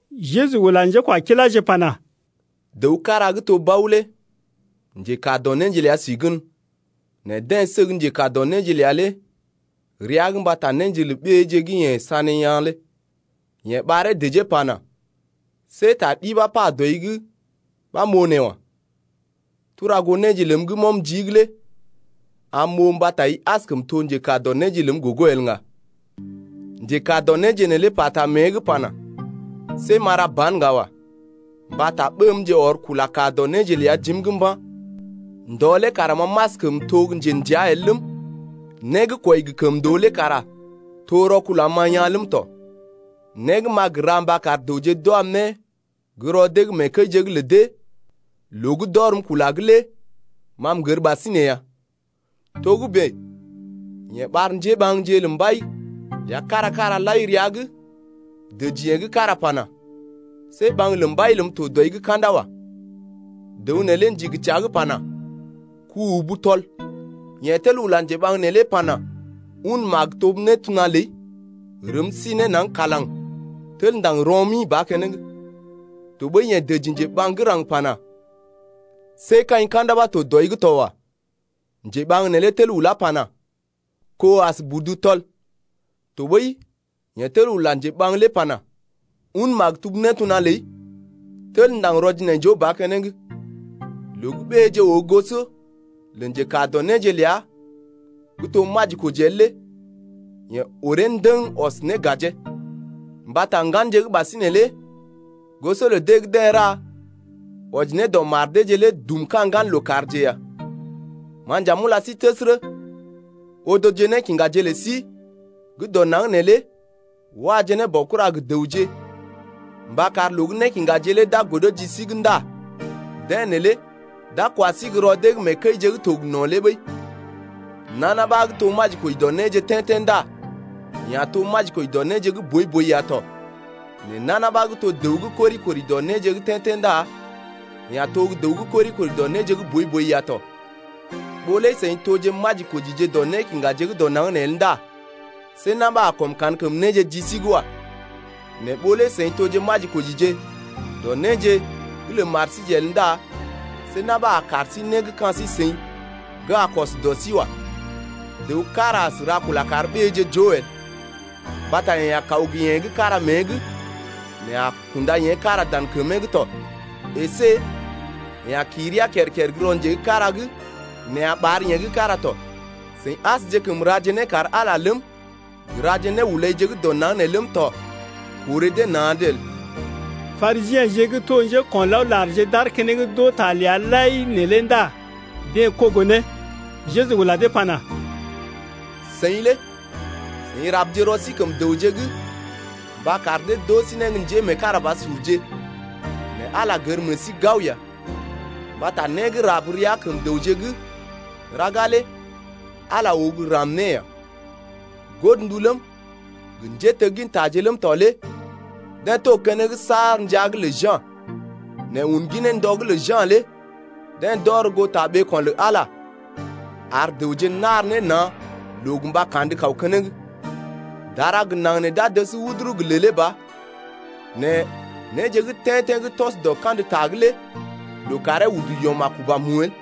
Jeju ula njékwakiláje pana: Dəw kára gə́ to bao lé njekaa dɔ néje ləa si gən, nɛ deḛ səg njekaa dɔ néje ləa neelé rəa’g mbata néje lə ɓéeje gə́ yeḛ sané yaa̰ lé. Yeḛ ɓaree dəjee pana: See ta ɗi ɓa pa dɔi’g ɓa m’oo nee wa. Tura goo néje ləm gə́ m’ɔm jii’g lé am m’oo mbata i askəm to njekaa dɔ néje ləm gogo el ŋga. Njekaa dɔ néje neelé pata mée’g pana: See m’a ra ban ŋga wa mbata ɓémje ɔr kula kaa dɔ néje ləa jim’g mba̰. Ndɔ lé kara ma m’askəm to gə́ njḛdəa el ləm, né gə́ kwɔi gə́ kəmndoo lé kara to rɔkul am-ma yaa̰ ləm tɔ. Né gə́ m’a gə ra mba kar dəwje d’wam ne gə́ rɔ dee’g mee kəije’g lə dee loo gə́ d’ɔrm kula’g lé ma m’gər ɓasinè ya. Togə́bè yeḛ ɓar njéɓaŋje lə mbai ləa kára-kára lai rəa’g dəji yeḛ gə́ kára pana: See ɓaŋg lə mbai ləm tɔ dɔi’g ka̰da wa. Dəw neelé ndigi təa’g pana: Ku-ubu tɔl. Yeḛ tel ula njeɓaŋ neelé pana: Un maktub nétona ləi rəm sí ne naŋg kalaŋ tel ndaŋg rɔ-mi ba keneŋ. Tɔɓəi yeḛ dəji njeɓaŋ gə́ raŋg pana: See kaḭ ka̰da ɓa to dɔi’g to wa. Njeɓaŋg neelé tel ulá pana: Ko as budu tɔl. Tɔɓəi yeḛ tel ula njeɓaŋ lé pana: Un maktub nétona ləi tel ndaŋg rɔ-jinaijoo ba keneŋ. Loo gə́ ɓéeje oo goso lə njekaa dɔ néje ləa gə́ to majikoji el lé yeḛ ɔree ndəŋ ɔs ne gajee. Mbata ŋganje gə́ ɓasinè lé goso lə dee gə́ deḛ ra wɔji ne dɔ mar deeje lé dum ka̰ ŋgan lookàrje ya. Ma nja m’ula sí təsərə, odoje nékiŋgaje lə sí gə́ dɔ naŋg nee lé waje ne baokura gə dəwje, mba kar loo gə́ nékiŋgaje lé d’a godo ji sí’g ndá deḛ neelé d’a kwa sí gə́ rɔ dee’g mee kəije gə́ to gə no̰ lé ɓəi. Nana ɓa gə́ to majikoji dɔ néje gə́ tḛ́-tḛ́ ndá yeḛ a to majikoji dɔ néje gə́ boi-boi ya tɔ, nɛ nana ɓa gə́ to dəw gə́ kori-kori dɔ néje gə́ tḛ́-tḛ́ ndá yeḛ a to gə́ dəw gə́ kori-kori dɔ néje gə́ boi-boi ya tɔ. Ɓó lé seḭ toje majikojije dɔ nékiŋgaje gə́ dɔ naŋg nee el ndá see na̰ ɓa a kɔm kankəm néje ji sí’g wa. Nɛ ɓó lé seḭ toje gə́ majikojije dɔ néje gə́ lə mar síje el ndá see na̰ ɓa a kar sí né gə́ ka̰ sí-seḭ gə́ a kɔs dɔ sí wa. Dəw kára as ra kula kar ɓéeje joo el. Mbata yeḛ a kaw gə yeḛ gə́ kára mée’g, nɛ a kunda yeḛ gə́ kára dan kəmee’g tɔ, əsé yeḛ a kii rəa kər-kər gə́ rɔ nje gə́ kára’g nɛ a ɓar yeḛ gə́ kára tɔ. Seḭ asjekəm raje né kar Ala ləm, gə raje néhulaije gə́ dɔ naŋg nee ləm tɔ, korè dee na̰’d el. Parisiḛje gə́ to njéko̰laolarje d’aar keneŋ d’oo ta ləa lai neelé ndá deḛ kogo ne. Jeju ula dee pana: Seḭ lé seḭ rabje rɔ sí kəm dəwje’g mba kar dee d’oo sí gə́ njémeekarabasurje nɛ Ala gər meḛ sí gao ya. Mbata né gə́ rab rəa kəm dəwje’g raga lé Ala lé oo gə́ ram né ya. Godndu ləm, gə njéteggintaje ləm tɔ lé deḛ to keneŋ saar ndəa’g lə Ja̰, nɛ un ginee ndɔ gə́ lə Ja̰ lé deḛ d’ɔr goo ta ɓeeko̰ lə Ala, ar dəwje nar ne na̰ loo gə mba kandə kaw keneŋ. Dara gə naŋg nee d’a dəs wuduru gə lèlé ba, nɛ néje gə́ tḛ́-tḛ́ gə́ tɔs dɔ kandə ta’g lé loo karee udu yɔm a kuba mu el.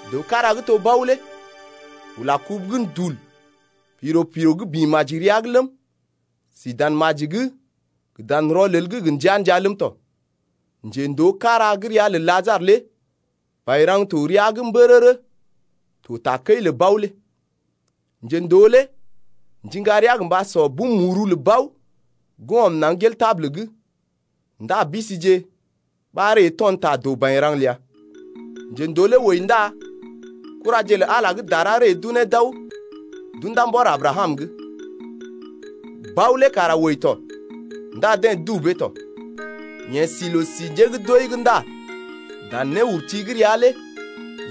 Dəw kára gə́ to bao lé ula kubu gə́ ndul piro-piro gə́ bḭ maji rəa’g ləm, si dan maji’g gə dan rɔlel’g gə ndəa-ndəa ləm tɔ. Njendoo kára gə́ ria lə Lajarə lé bairaŋ to rəa’g mbərərə to takəi’g lə bao lé. Njendoo lé ndiŋga rəa gə mba sɔ bum muru lə bao gə́ ɔm naŋg gel tabul’g. Ndá bisije ɓa ree to̰ ta doo bairaŋ ləa. Njendoo lé wəi ndá kuraje lə Ala gə́ dara ree d’unee d’aw d’unda mbɔr Abrakam’g. Bao lé kara wəi tɔ ndá deḛ dubee tɔ. Yeḛ si loo-si njé gə́ d’wəi’g ndá dan néurti gə́ rəa lé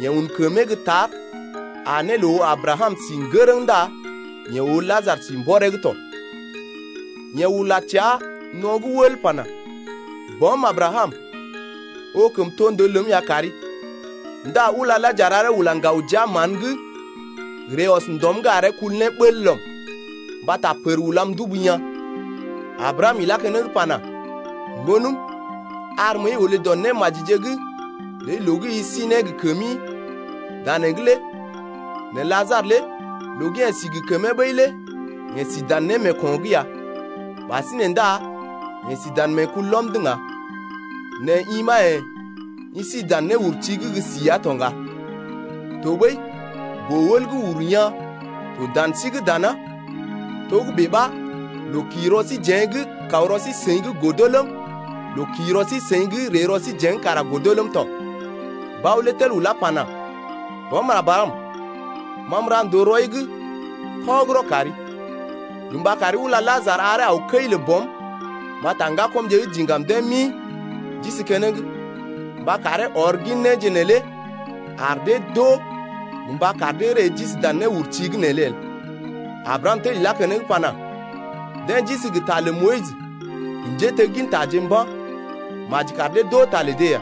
yeḛ un kəmee gə́ tar aa ne loo oo Abrakam si ŋgərəŋ ndá yeḛ oo Lajarə si mbɔree’g tɔ. Yeḛ ula təa no̰’g wəl pana: Bɔm Abrakam, oo kəmtondoo ləm ya kari ndá ula Lajarə aree ula ŋgaw jia mán’g ree ɔs ndɔm’g aree kul ne bəl lɔm, mbata pər ulam ndubu yaa̰. Abrakam ilá keneŋ pana: Ŋgonəm, ar məəi olé dɔ némajije’g ləi loo gə́ i si ne gə kəmi danee’g lé nɛ Lajarə lé loo gə́ yeḛ si gə kəmee ɓəi lé yeḛ si dan némeeko̰’g ya, ɓasinè ndá yeḛ si dan meekulɔm’g ŋga, nɛ i ɓa yḛ̀ i si dan néurti’g gə́ si ya to ŋga. Tɔɓəi boo-wəl gə́ uru yaa̰ to dan sí’g dana, togə́bè ɓa loo kḭ rɔ síjeḛ’g kaw rɔ sí-seḭ’g godo ləm, loo kḭ rɔ sí-seḭ’g ree rɔ síjeḛ’g kara godo ləm tɔ. Bao lé tel ulá pana: Bɔm Abrakam, ma m’ra ndòo rɔi’g kɔgərɔ kari, gə mba kari ula Lajarə aree aw kəi lə bɔm mbata ŋgakɔmje gə́ diŋgam deḛ mi d’isi keneŋ, mba karee ɔr gin néje neelé ar dee d’oo gə mba kar dee ree d’isi dan néurti’g neelé el. Abrakam tel ilá keneŋ pana: Deḛ d’isi gə ta lə Moyis gə njéteggintaje mba̰, maji kar dee d’oo ta lə dee ya.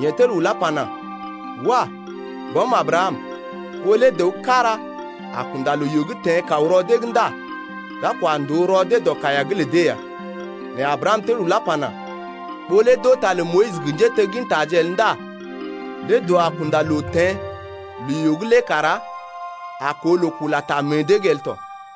Yeḛ tel ulá pana: Wah! bɔm Abrakam, ɓó lé dəw kára a kunda loo-yoo teḛ kaw rɔ dee’g ndá d’a kwa ndòo rɔ dee dɔ kaiya’g lə dee ya. Nɛ Abrakam tel ulá pana: Ɓó lé d’oo ta lə Moyis gə njéteggintaje el ndá lé dəw a kunda loo teḛ loo-yoo’g lé kara a koo loo kula ta meḛ dee’g el tɔ.